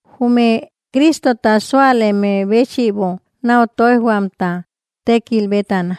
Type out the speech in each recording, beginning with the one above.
Jume Cristota súaleme béchïbo nau toijhuamta tékil bétana,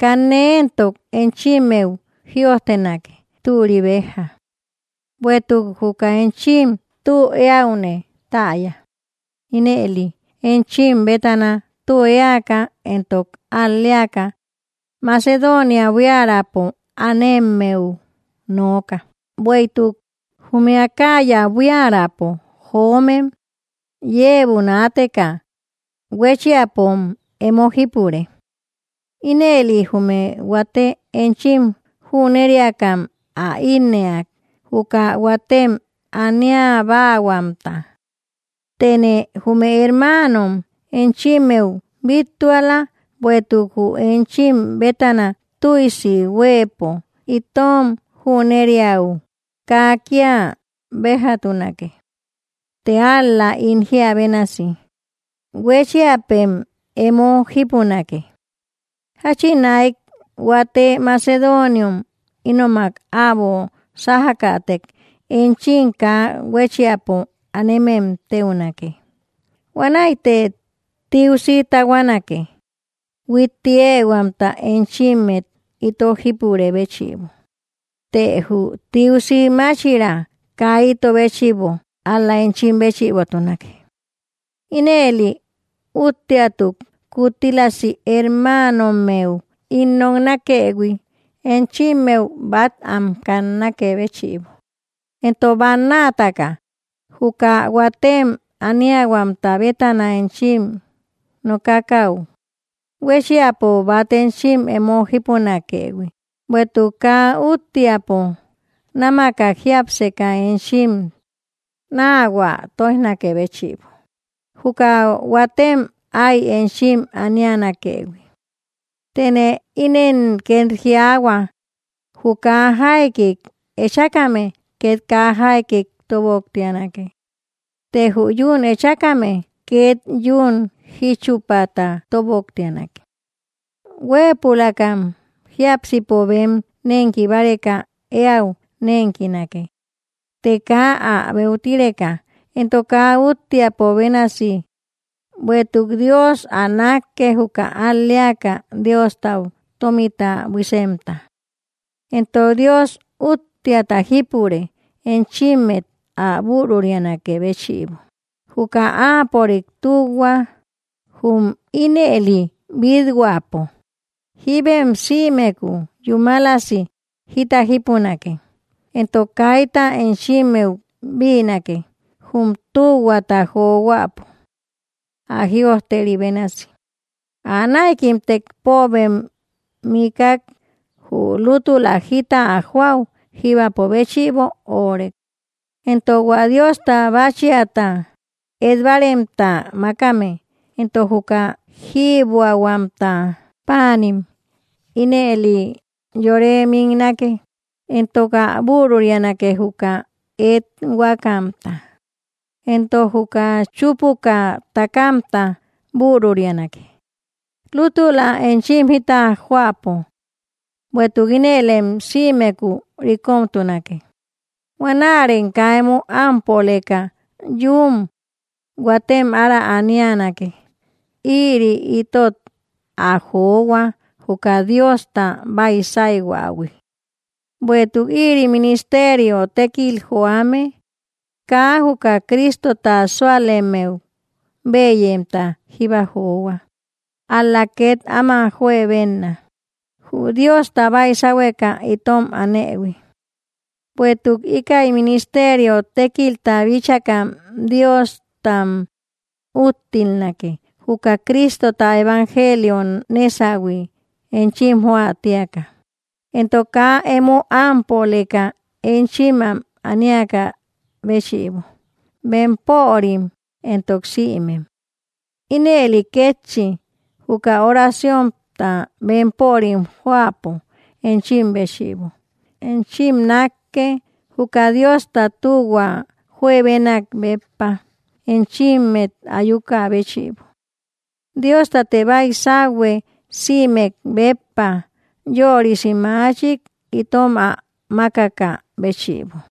kanne éntok enchimmeu jïojtenake türi bejja. Buéïtuk juka enchim tü eäune täya, ínëline enchim bétana tü eäka entok al‑leaka Macedonia buiärapo anemmeu nooka, bueïtuk jume Acaya buiärapo joomem iebo naateka huechiampom emo jípure; ínëli jume huate enchim jüneriakam ä innëak juka huatem aniabahuamta. Tëne jume hermanom enchimmeu bittuala, bueïtuk jü enchim bétana tüisi huëpo itom jünereaü, kaa kia bejatunake; të ál‑la ín jiä bénasi, huechiapem emo jípunake. Jachinaïk huate macedoniom ínomak äbo sajakätek, enchim kaa huéchiapo anemem teunake, huanäite tiusi tahuanake, huitti ehuamta enchimmet ito jípurë béchïbo, të jü tiusi máchira kaa ito béchïbo ál‑la enchim béchïbotunake. Ínëli, úttiatuk kuttílasi hermanommeu ín noknakëhui, enchimmeu bat am kannakë béchïbo, entok bannatka juka huatem aniahuamta bétana enchim nokakaü, huéchiapo bat enchim emo jípunakëhui, bueïtuk kaa úttiapo námakak jiapseka enchim nahuä toijnakë béchïbo juka huatem ái enchim anianakëhui. Tëne ínen ket jiaahua: Jü kaa jaikik echákame, ket kaa jaikik toboktianake; të jü yún echákame, ket yún jichupata toboktianake. Hueëpulakam jiápsipo bem nenki báreka eäu nenkinake; të kaa ä beutireka, entok kaa úttiapo bénasi, bueïtuk Dios ä nakke juka al‑leaka, Diostau tomita buisemta. Entok Dios úttiata jipure, enchimmet ä bürurianakë béchïbo juka Áapörik tühua, jum ínëli bithuäpo, jibem sïmeku yúmalasi jita jípunake entok kayta enchimmeu bïnake jum tühuata johuäpo. Ä jïojteri bénasi: Ä naïkimtek, póobem miikak, jü lútula jita ä joáu, jíbapo béchïbo órek. Entok hua Dios báchiata et‑baremta makame, entok juka jïbuamta paanim, ínëli yore miknake entok ä bürurianake juka ethuakamta, entok juka chupuka takamta bürurianake, lútula enchim jita joapo. Bueïtuk ínëlem sïmeku rikomtunake huanärem kaa emo ámpöleka yún huatem ára anianake, ïri itot ä johua juka Diosta baisaihuähui. Bueïtuk ïri ministerio tékkil johuame, kaa juka Cristota sualemmeu bëyemta jíba johua, ál‑la ket áma juebenna jü Diosta baisáhueka itom anëhui. Bueïtuk íkäi ministerio tékilta bíchakam Diostam úttilnake, juka Cristota evangelio nesahui enchim joä tiaka, entok kaa emo ámpöleka enchim am aníaka béchïbo, bempörim entok sïmem. Ínëli kétchi juka oraciónta bempörim joäpo enchim béchïbo, enchimim nakke, juka Diosta tühua juebenak béppa enchimet ayukä béchïbo. ¡Diostate baisauhue, sïmek béppa yörisi machik itom ä makaka béchïbo!